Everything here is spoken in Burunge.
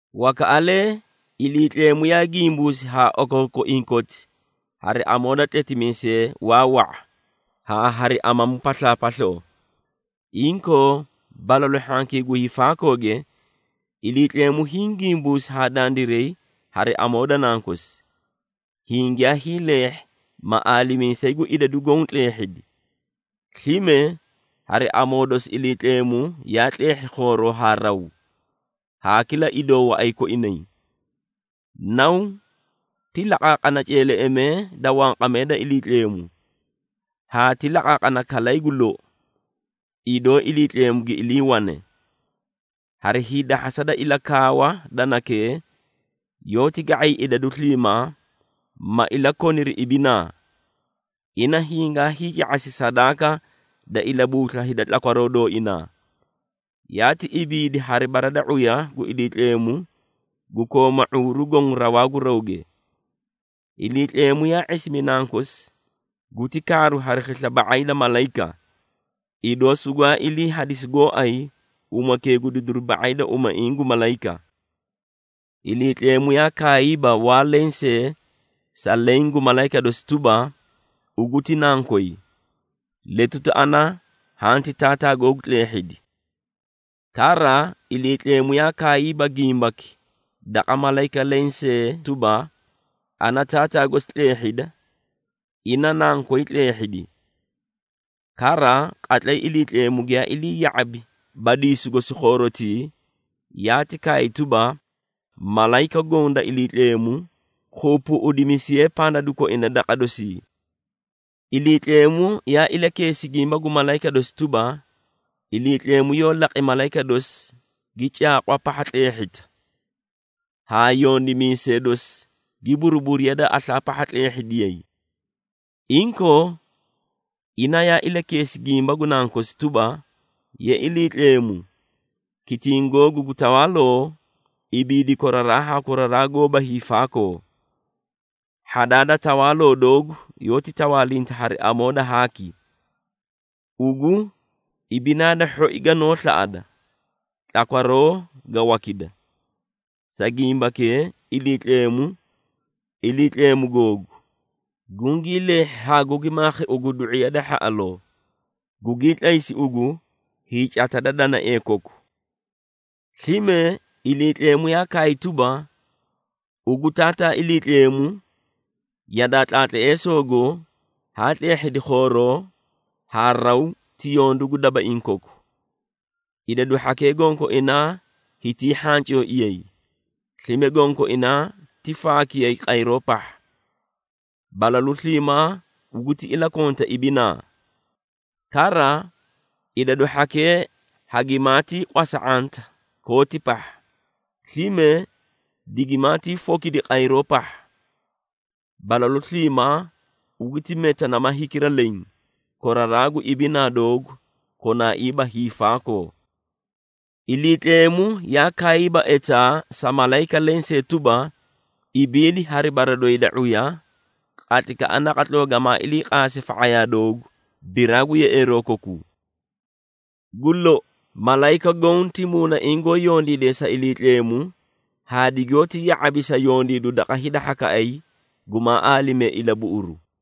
Wakaꞌalee Iliitleemu yaa gimbuusi haa okookoiĩ koti hari amoo da tletimiisee waa wa⁄a haa hari amamu paslaapasloo. Inkoo, balalu hhankii gu hiifaakooge, Iliitleemu hiĩ gimbuusi haa dandiray hari amoo da Nankosi, hiĩ giyaa hiileehhi ma aalimiisayi gu idadu goõ tleehhidi. Slime hari amoo dosi Iliitleemu yaa tleehhi khooroo haa raw, haa kila idoo waꞌay koinay. Naw ti laqaaqana ceeleꞌemee da wanqamee da Iliitleemu, haa ti laqaaqana kalay gu lou, idoo Iliitleemu gi iliiwane. Hari hiidahhasa da ilakaawa da nakee, yoóti ga⁄ay idadu sliimaa, ma ilakoniri ibinaa. Ina hingaa hiica⁄asi sadaaka da ilabuusla hida tlakwaroo dooina, yaati ibiidi hari bara da ⁄uya gu Iliitleemu gu kooma ⁄uuru goõ rawaa gu rawge. Iliitleemu yaa ⁄isimi Nankosi, guti kaaru hari khisla ba⁄ay da malayika, idoo sugwaa ilii hadisi gooay umake gu didiru ba⁄ay da umaiĩ gu malayika. Iliitleemu yaa kaayiiba waa lensee sa leẽ gu malayika dosi tuba, “Ugu ti nankoy, letuti ana hanti taataa googu tleehhidi.” Kara Iliitleemu yaa kaayiiba gimbaki daqa malayika lensee tuba, “Ana taataa gosi tleehhida, ina nankoy tleehhidi.” Kara, qatlay Iliitleemu giyaa ilii ya⁄abi badiisu gosi khoorotii, yaati kaay tuba, “Malayika goõ da Iliitleemu, gi keebeeꞌemiti daqa dosii.” Iliitleemu yaa ilakeesi gimba gu malayika dosi tuba, “Iliitleemu yoó laqi malayika dosi gi caaqwa pahha tleehhita, haa yondimiisee dosi gi buruburiya da aslaa pahha tleehhidiyay.” Inkoo, ina yaa ilakeesi gimba gu Nankosi tuba, “Ye Iliitleemu, kitiĩ googu gu tawaaloo, ibiidi koraraa haa koraraa goóba hiifaakoo. Hhadaa da tawaaloo doogu yoóti tawaalinta hari amoo da haaki. Ugu ibinaa da hhoi ganoó slaꞌada, tlakwaroo ga wakida. Sa gimbakee, Iliitleemu, Iliitleemu googu, gungii leehhi haa gugi maakhi ugu du⁄iya da hhaꞌaloo, gugii tlaysi ugu hiicata da danaee koku.” Slime Iliitleemu yaa kaay tuba, “Ugu Taataa Iliitleemu, yadaa tlaatleesogo haa tleehhidi khooroo, haa raw ti yondu gu dabaiĩ koku. Idadu hhakee gonkoinaa hitii hhancooiyay, slime gonkoinaa ti faakiyay qayroo pahha. Balalu sliimaa ugu ti ilakonta ibinaa. Kara, idadu hhakee hagimaatii qwasa⁄anta kooti pahha, slime digimaatii fokidi qayroo pahha. Balalu sliimaa ugu ti meta nama hikira leẽ, koraraa gu ibinaa doogu konaaiiba hiifaakoo.” Iliitleemu yaa kaayiiba etaa sa malayika lensee tuba, “Ibiidi hari bara doyi da ⁄uya, qatlaykaꞌa naqatloo gamaa ilii qaase fa⁄ayaa doogu, biraa gu yeꞌeeroo kokuu.” Gu lou, malayika goõ ti muunaiĩ goó yondiide sa Iliitleemu haa digoóti ya⁄abi sa yondiidu daqa hida hhakaꞌay gumaa aalimee ilabuꞌuru.